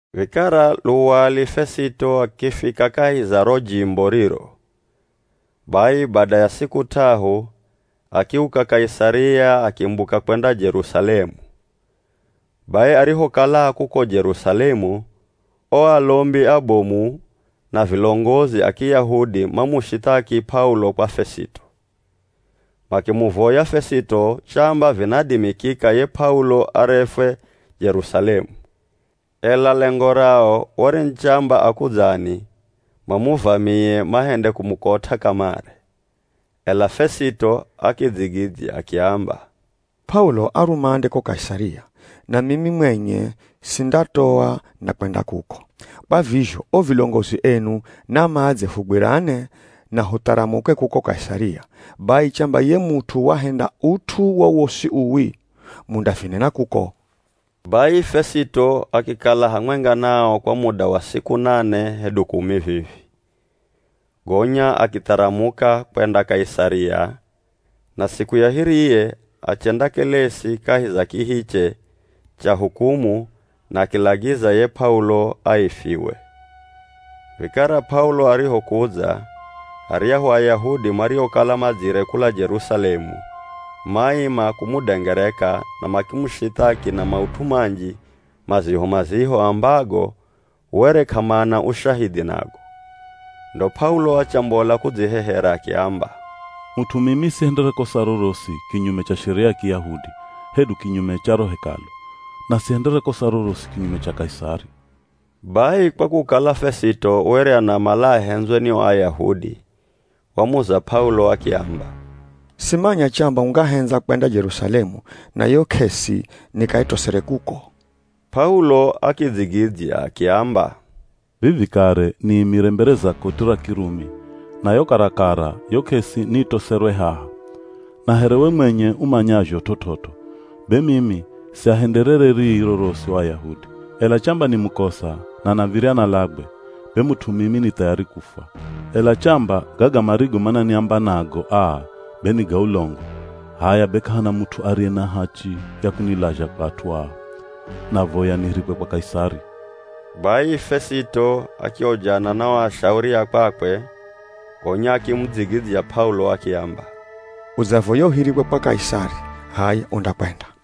Vikara luwali Fesito akifika kahi za ro jimbo riro. Bai bada ya siku t'ahu akiuka Kaisaria akimbuka kwenda Jerusalemu. Bai arihokala a kuko Jerusalemu o alombi abomu na vilongozi a Kiyahudi mamushithaki P'aulo kwa Fesito. Makimuvoya Fesito chamba vinadimikika ye P'aulo arefwe Jerusalemu. Ela lengo rao were ni chamba akudzani, mamuvamie mahende kumukot'a kamare. Ela Fesito akidzigidzya akiamba, “P'aulo a rumande ko Kaisaria, na mimi mwenye sindatoa, ndakwenda kuko. Kwa vizho o vilongozi enu na madze fugwirane na hutharamuke kuko Kaisaria, bai chamba ye mut'u wahenda ut'u wowosi uwi, mundavinena kuko.” Bai Fesito akikala hamwenga nao kwa muda wa siku nane hedu kumi vivi gonya akitharamuka kwenda Kaisaria, na siku ya hiriye achendakelesi kahi za kihiche cha hukumu na akilagiza ye P'aulo aifiwe. Vikara P'aulo arihokudza, aryahu Ayahudi mariokala madzire kula Jerusalemu maima kumudengereka na makimushithaki na maut'u manji maziho-maziho ambago were k'amana ushahidhi nago. Ndo P'aulo achambola kudzihehera akiamba, “Mut'u mimi sihendere kosa rorosi kinyume cha Sheria ya Kiyahudi hedu kinyume cha ro Hekalu, na sihendere kosa rorosi kinyume cha Kaisari.” Bai kwa kukala Fesito were anamala ahendzwe ni o Ayahudi, wamuza P'aulo akiamba, “Simanya chamba ungahendza kwenda Jerusalemu na yo k'esi nikaitosere kuko?” P'aulo akidzigidzya akiamba, “Vivi kare niimire mbere za koti ra Kirumi na yo karakara yo k'esi niitoserwe haha. Na here we mwenye umanyazho t'ot'ot'o be mimi siahenderere rii rorosi o Ayahudi. Ela chamba ni mukosa na nav̱irya nalagwe, be mut'u mimi ni thayari kufwa, ela chamba gaga marigo mananiamba nago aa be ni ga ulongo, h'aya be k'ahana mut'u ariye na hachi ya kunilazha kwa at'u aa. Navoya nihirikwe kwa Kaisari.” Bai Fesito akiojana na o ashauri a kwakwe gonya akimudzigidzya P'aulo akiamba, “Udzavoya uhirikwe kwa Kaisari, h'aya undakwenda.”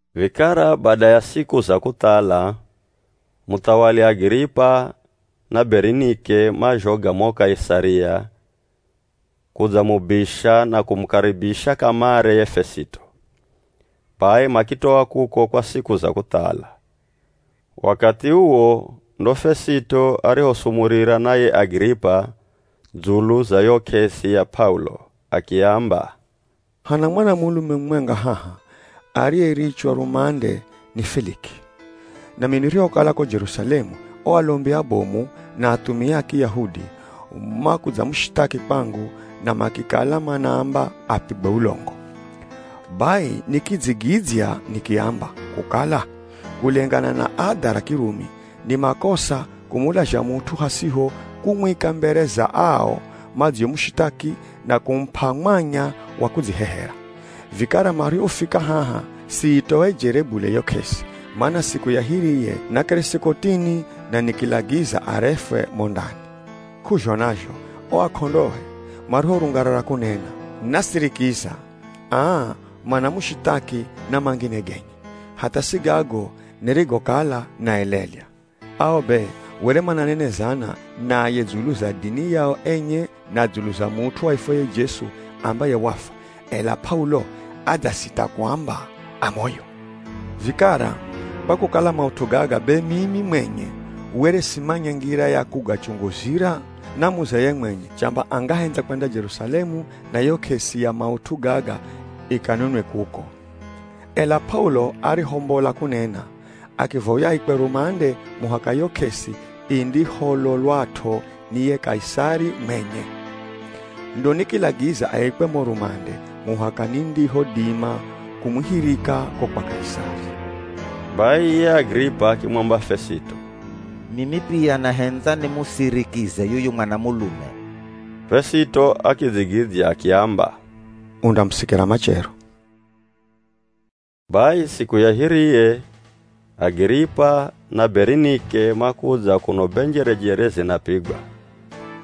Vikara bada ya siku za kuthala, muthawali Agiripa na Berinike mazhoga mo Kaisaria kudzamubisha na kumukaribisha kamare ye Fesito. Bai makitoa kuko kwa siku za kuthala. Wakathi uwo ndo Fesito arihosumurira na ye Agiripa dzulu za yo k'esi ya P'aulo. Akiamba, “Hana mwanamulume mumwenga haha ariyerichwa rumande ni Feliki, nami nirihokala ko Jerusalemu, o alombi abomu, na athumia a Kiyahudi makudzamushithaki kwangu na makikala manaamba apigwe ulongo. Bai nikidzigidzya nikiamba kukala kulengana na adha ra Kirumi, ni makosa kumulazha mut'u hasiho kumwika mbere za ao madziomushithaki na kumup'a mwanya wa kudzihehera. Vikara marihofika haha siitoejere bule yo k'esi, mana siku ya hiriye nakeresi kotini na nikilagiza arefwe mo ndani. K'uzhona zho o ak'ondoe marihorungarara kunena, nasirikiza, aa, manamushithaki na mangine genye, hatha si gago nirigokala naelelya. Ao be were mananenezana naye dzulu za dini yao enye na dzulu za mut'u aifwaye Jesu ambaye wafwa, ela P'aulo adzasita kuamba a moyo. Vikara kwa kukala maut'u gaga be mimi mwenye were simanya ngira ya kugachunguzira, namuza ye mwenye chamba angahendza kwenda Jerusalemu na yo k'esi ya maut'u gaga ikanenwe kuko. Ela P'aulo arihombola kunena, akivoya aikwe rumande muhaka yo k'esi indihololwat'o ni ye Kaisari mwenye. Ndo nikilagiza aikwe mo rumande muhaka nindihodima kumuhirika ko kwa Kaisari.” Bai ye Agiripa akimwamba Fesito, “Mimi pia nahendza nimusirikize yuyu mwanamulume.” Fesito akidzigidzya akiamba, “Undamusikira machero.” Bai siku ya hiriye Agiripa na Berinike makudza kuno be njerejere zinapigwa,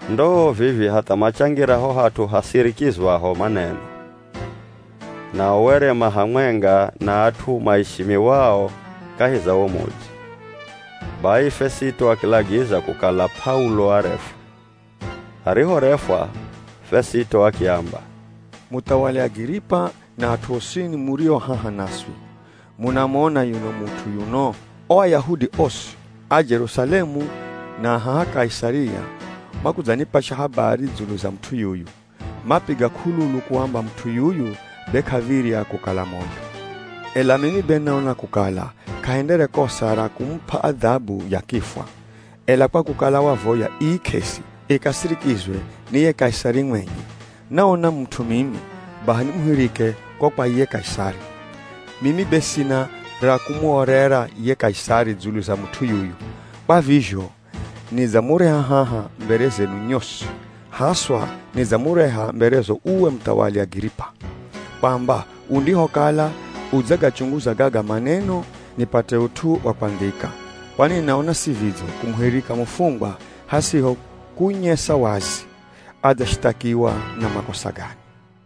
ndoo vivii hatha machangira ho hat'u hasirikizwaho maneno. Nao were ma hamwenga na at'u maishimiwao kahi za wo mudzi. Bai, Fesito akilagiza kukala P'aulo arefwe. Arihorefwa, Fesito akiamba, “Muthawali Agiripa na at'u osini murio haha naswi, munamona yuno mut'u yuno? O Ayahudi osi, a Jerusalemu na a haha Kaisaria makudzanipasha habari dzulu za mut'u yuyu. Mapiga k'ululu kuamba mut'u yuyu be k'av̱irya kukala moyo. Ela mimi be naona kukala k'ahendere kosa ra kumup'a adhabu ya kifwa, ela kwa kukala wavoya ii k'esi ikasirikizwe ni ye Kaisari mwenye, naona mut'u mimi baha nimuhirike ko kwa ye Kaisari. Mimi be sina ra kumuorera ye Kaisari dzulu za mut'u yuyu, kwa vizho nidzamureha haha mbere zenu nyosi, haswa nidzamureha mberezo uwe Muthawali Agiripa, kwamba undihokala udzagachunguza gaga maneno nipate ut'u wa kwandhika. Kwani naona si vidzo kumuhirika mufungwa hasiho kunyesa wazi adzashithakiwa na makosa gani.”